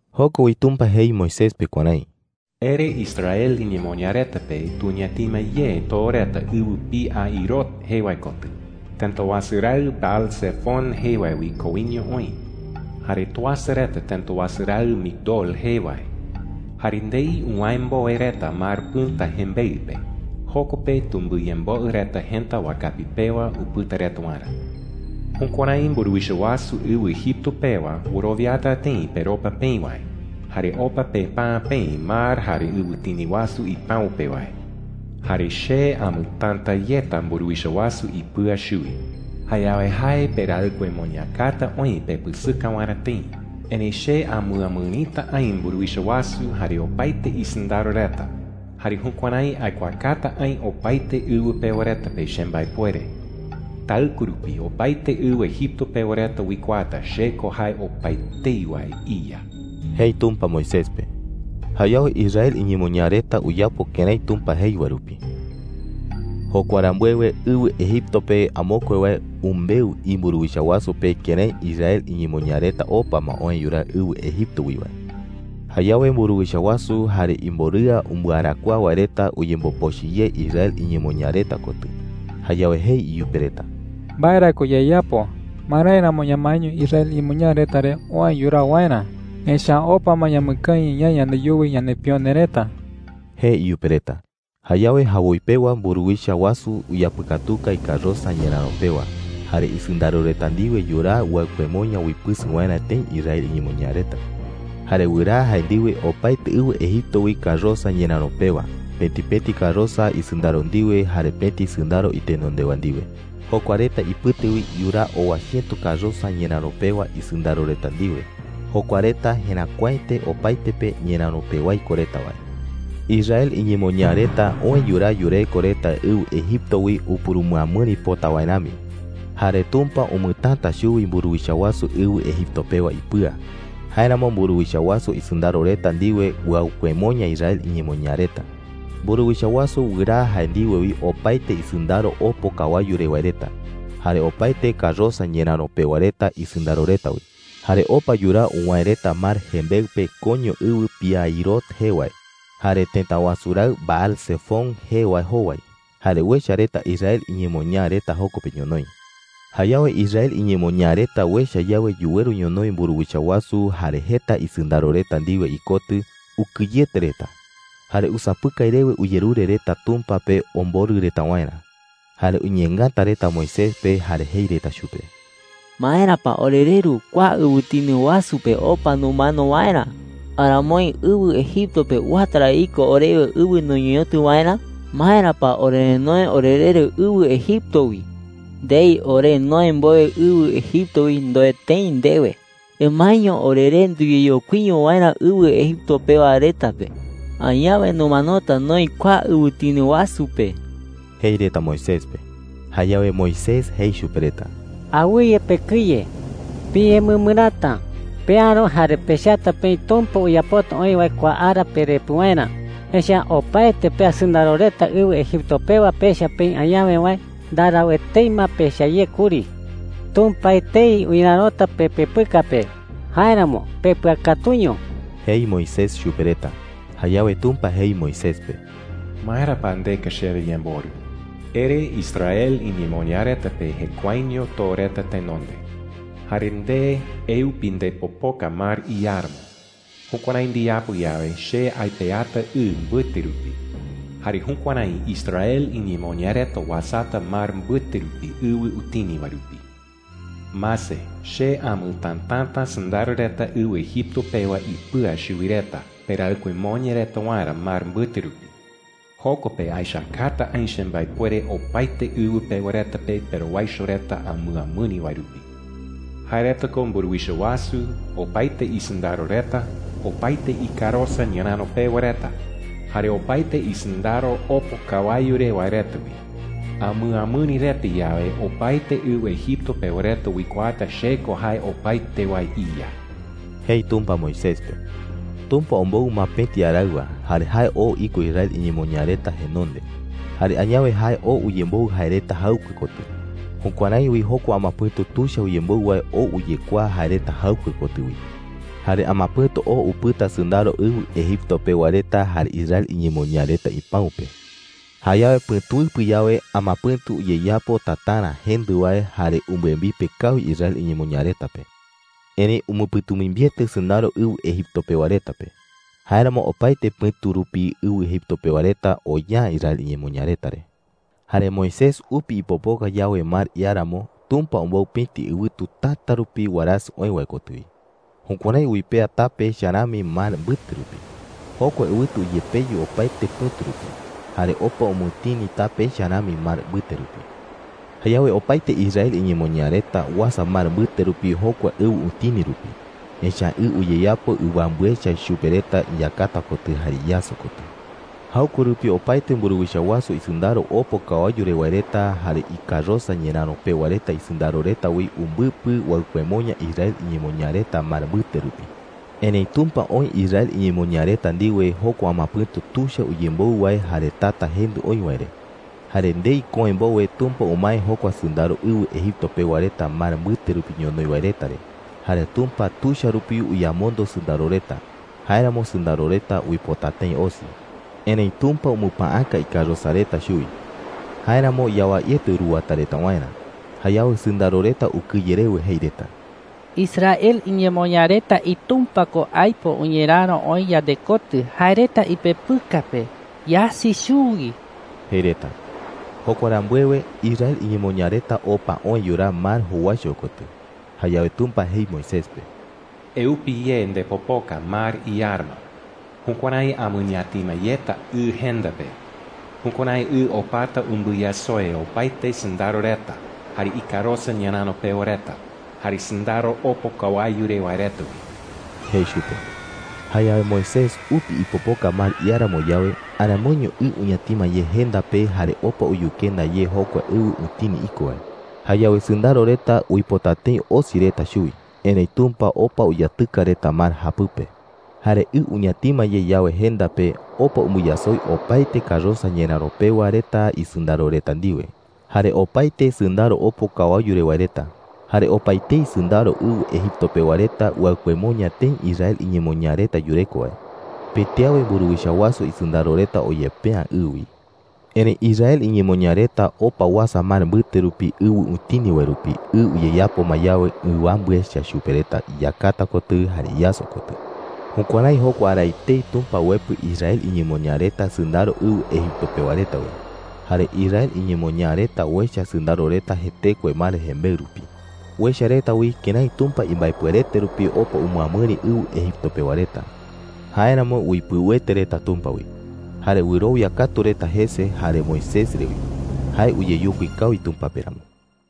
Joko wi Tumpa jei Moisés pe kuärái: “Ere Israel iñemoñaa reta pe tuñatima ye too reta ɨwɨ Pi-hahirot jee wae kotɨ, tëta wasu raɨ Baal-zefón jee wae wi koiño oï. Jare tuasa reta tëta wasu raɨ Migdol jee wae. Jare ndei uwäe mbowe reta Mar Pɨ̈ta jembeɨ pe, joko pe tumbɨyemboɨ reta jëta wakapi pewa upɨta reta waerä. Jukuärái mburuwicha wasu ɨwɨ Egipto pewa wɨrowiata tëi peropa peï wae jare opa pepäa peï mar jare ɨwɨtini wasu ipäu pe wae,” jei. “Jare che amɨtäta yeta mburuwicha wasu ipɨa chuwi,” jei. “Jayawe jae peraɨkuemoñakata oï pepɨsɨka waerä tëi. Erëi che amɨamɨrita aï mburuwicha wasu jare opaete isɨndaro reta, jare jukuärái aikuaakata aï opaete ɨwɨ pewa reta pe chembaepuere. Taɨkue rupi opaete ɨwɨ Egipto pewa reta uikuaata che ko jae opaetei wae iYa,” jei Tumpa Moisés pe. Jayawe Israel iñemoñaa reta uyapo kërái Tumpa jei wae rupi. Jokua rambuewe, ɨwɨ Egipto pe amokue wae umbeu imburuwicha wasu pe kërái Israel iñemoñaa reta opa ma oë yuraa ɨwɨ Egipto wi wae. Jayawe mburuwicha wasu jare imborɨa umbɨarakuaa wae reta uyembopochɨ ye Israel iñemoñaa reta kotɨ. Jayawe jei iyupe reta: “¿Mbae ra ko yayapo? ¿Marái ramo ñamaeño Israel iñemoñaa reta re oë yuraa waerä? ¡Echa’ä opa ma ñamɨkañɨ ñaï yandeyuwi yanepione reta!” jei iyupe reta. Jayawe jawoi pewa mburuwicha wasu uyapɨkatuka ikarosa ñeräro pewa, jare isɨndaro reta ndiwe yuraa uaɨkuemoña uipɨsɨ waerä tëi Israel iñemoñaa reta. Jare wɨraa jae ndiwe opaete ɨwɨ Egipto wi karosa ñeräro pewa, pëti pëti karosa isɨndaro ndiwe jare pëti sɨndaro itenondewa ndiwe. Jokua reta ipɨte wi yuraa owa chiëto karosa ñeräro pewa isɨndaro reta ndiwe. Jokua reta jeräkuaete opaete pe ñeräro pewái ko reta wae. Israel iñemoñaa reta oë yuraa yureko reta ɨwɨ Egipto wi upurumɨamɨri pota wae rami. Jare Tumpa umɨtäta chuwi mburuwicha wasu ɨwɨ Egipto pewa ipɨa. Jáeramo mburuwicha wasu isɨndaro reta ndiwe uaɨkuemoña Israel iñemoñaa reta. Mburuwicha wasu wɨraa jae ndiwe wi opaete isɨndaro opo kawayu re wae reta, jare opaete karosa ñeräro pewa reta isɨndaro reta wi. Jare opa yuraa uwäe reta mar jembeɨ pe koiño ɨwɨ Pi-hahirot jee wae, jare tëta wasu raɨ Baal-zefón jee wae jowai. Jare uecha reta Israel iñemoñaa reta joko pe ñonoï. Jayawe Israel iñemoñaa reta uecha yawe yuweru ñonoï mburuwicha wasu jare jeta isɨndaro reta ndiwe ikotɨ, ukɨyete reta. Jare usapɨkai rewe uyerure reta Tumpa pe omborɨ reta waerä. Jare uñeengata reta Moisés pe jare jei reta chupe: “¿Maera pa orereru kua ɨwɨtini wasu pe opa numano waerä?” jei reta. “¿Aramoi ɨwɨ Egipto pe uata ra iko orewe ɨwɨ nuñeñotɨ waerä? ¿Maera pa orerenoe orereru ɨwɨ Egipto wi?” jei reta. “Ndei ore noë mbowe ɨwɨ Egipto wi ndoe tëi ndewe: ‘Emaeño oreré nduyeyokuiño waerä ɨwɨ Egipto pewa reta pe,’ ndoe ndewe. Añawe numanota noï kua ɨwɨtini wasu pe,” jei reta Moisés pe. Jayawe Moisés jei chupe reta: “Awɨye pekɨye,” jei. “Piñemɨmɨräta. Peäro jare pechata peï Tumpa uyapota oï wae kua ara perepɨ waerä. Echa’ä opaete pea sɨndaro reta ɨwɨ Egipto pewa pecha peï añawe wae, ndarau etei ma pecha ye kuri. Tumpa etei uñerärota pepepɨka pe; jáeramo pepɨakatuño,” jei Moisés chupe reta. Jayawe Tumpa jei Moisés pe: “¿Maera pa ndeka chewe yemborɨ?” jei. “Ere Israel iñemoñaa reta pe jekuaeño too reta tenonde. Jare nde, eupi ndepopoka mar iáramo. Jukuärái ndiyapo yawe, che aipeata ɨ mbɨte rupi. Jare jukuärái Israel iñemoñaa reta uasata mar mbɨte rupi ɨwɨ utini wae rupi,” jei chupe. “Mase, che amɨtätata sɨndaro reta ɨwɨ Egipto pewa ipɨa chuwi reta peraɨkuemoña reta waerä mar mbɨte rupi. Joko pe aechakata aï chembaepuere opaete ɨwɨ pewa reta pe perowaicho reta amɨamɨri wae rupi. Jae reta ko mburuwicha wasu, opaete isɨndaro reta, opaete ikarosa ñeräro pewa reta, jare opaete isɨndaro opo kawayu re wae reta wi. Amɨamɨri reta yawe, opaete ɨwɨ Egipto pewa reta uikuaata che ko jae opaete wae iYa,” jei Tumpa Moisés pe. Tumpa ombou ma pëti araɨwa, jare jae oo iko Israel iñemoñaa reta jenonde. Jare añawe jae oo uyemboɨ jae reta jaɨkue kotɨ. Jukuärái wi jokua amapɨ̈tu tuicha uyemboɨ wae oo uyekuaa jae reta jaɨkue kotɨ wi. Jare amapɨ̈tu oo upɨta sɨndaro ɨwɨ Egipto pewa reta jare Israel iñemoñaa reta ipäu pe. Jayawe pɨ̈tuɨpɨ yawe, amapɨ̈tu uyeyapo tatarä jendɨ wae jare umbɨembipe kawi Israel iñemoñaa reta pe. Erëi umɨpɨ̈tumimbiete sɨndaro ɨwɨ Egipto pewa reta pe. Jáeramo opaete pɨ̈tu rupi ɨwɨ Egipto pewa reta oya’ä Israel iñemoñaa reta re. Jare Moisés upi ipopoka yawe mar iáramo, Tumpa ombou pëti ɨwɨtu täta rupi warasɨ oë wae kotɨ wi. Jukuärái uipea tape echa rami mar mbɨte rupi. Jokua ɨwɨtu uyepeyu opaete pɨ̈tu rupi, jare opa umɨtini tape echa rami mar mbɨte rupi. Jayawe opaete Israel iñemoñaa reta uasa mar mbɨte rupi jokua ɨwɨ utini rupi, echa’ä ɨ uyeyapo ɨwambɨ echa chupe reta iyakata kotɨ jare iyaso kotɨ. Jaɨkue rupi opaete mburuwicha wasu isɨndaro opo kawayu re wae reta jare ikarosa ñeräro pewa reta isɨndaro reta wi umbɨpɨ uaɨkuemoña Israel iñemoñaa reta mar mbɨte rupi. Erëi Tumpa oï Israel iñemoñaa reta ndiwe jokua amapɨ̈tu tuicha uyemboɨ wae jare tata jendɨ oï wae re. Jare ndei köe mbowe Tumpa umae jokua sɨndaro ɨwɨ Egipto pewa reta mar mbɨte rupi ñonoï wae reta re. Jare Tumpa tuicha rupi uyamondo sɨndaro reta. Jáeramo sɨndaro reta uipota tëi osi. Erëi Tumpa umɨpäaka ikarosa reta chuwi; jáeramo yawaiete uruwata reta waerä. Jayawe sɨndaro reta ukɨye rewe jei reta: “¡Israel iñemoñaa reta iTumpa ko aipo uñeräro oï yandekotɨ jae reta ipepɨka pe! ¡Yasi chuwi!” jei reta. Jokua rambuewe, Israel iñemoñaa reta opa oë yuraa mar jowaicho kotɨ. Jayawe Tumpa jei Moisés pe: “Eupi ye ndepopoka mar iáramo. Jukuärái amɨñatima yeta ɨ jenda pe. Jukuärái ɨ opata umbɨyasoi opaete sɨndaro reta, jare ikarosa ñeräro pewa reta, jare sɨndaro opo kawayu re wae reta wi,” jei chupe. Jayawe Moisés upi ipopoka mar iáramo yawe, aramoiño ɨ uñatima ye jenda pe jare opa uyukenda ye jokua ɨwɨ utini iko wae. Jayawe sɨndaro reta uipota tëi osi reta chuwi, erëi Tumpa opa uyatɨka reta mar japɨpe. Jare ɨ uñatima ye yawe jenda pe, opa umbɨyasoi opaete karosa ñeräro pewa reta isɨndaro reta ndiwe, jare opaete sɨndaro opo kawayu re wae reta, jare opaetei sɨndaro ɨwɨ Egipto pewa reta uaɨkuemoña tëi Israel iñemoñaa reta yureko wae. Pëti awe mburuwicha wasu isɨndaro reta oyepe’ä ɨ wi. Erëi Israel iñemoñaa reta opa uasa mar mbɨte rupi ɨwɨ utini wae rupi ɨ uyeyapo ma yawe ɨwambɨ echa chupe reta iyakata kotɨ jare iyaso kotɨ. Jukuärái jokua ara etei Tumpa uepɨ Israel iñemoñaa reta sɨndaro ɨwɨ Egipto pewa reta wi. Jare Israel iñemoñaa reta uecha sɨndaro reta jetekue mar jembeɨ rupi. Uecha reta wi kërái Tumpa imbaepuerete rupi opa umɨamɨri ɨwɨ Egipto pewa reta. Jáeramo uipɨuete reta Tumpa wi. Jare wɨrowia katu reta jese jare Moisés re wi, jae uyeyokui kawi Tumpa pe ramo.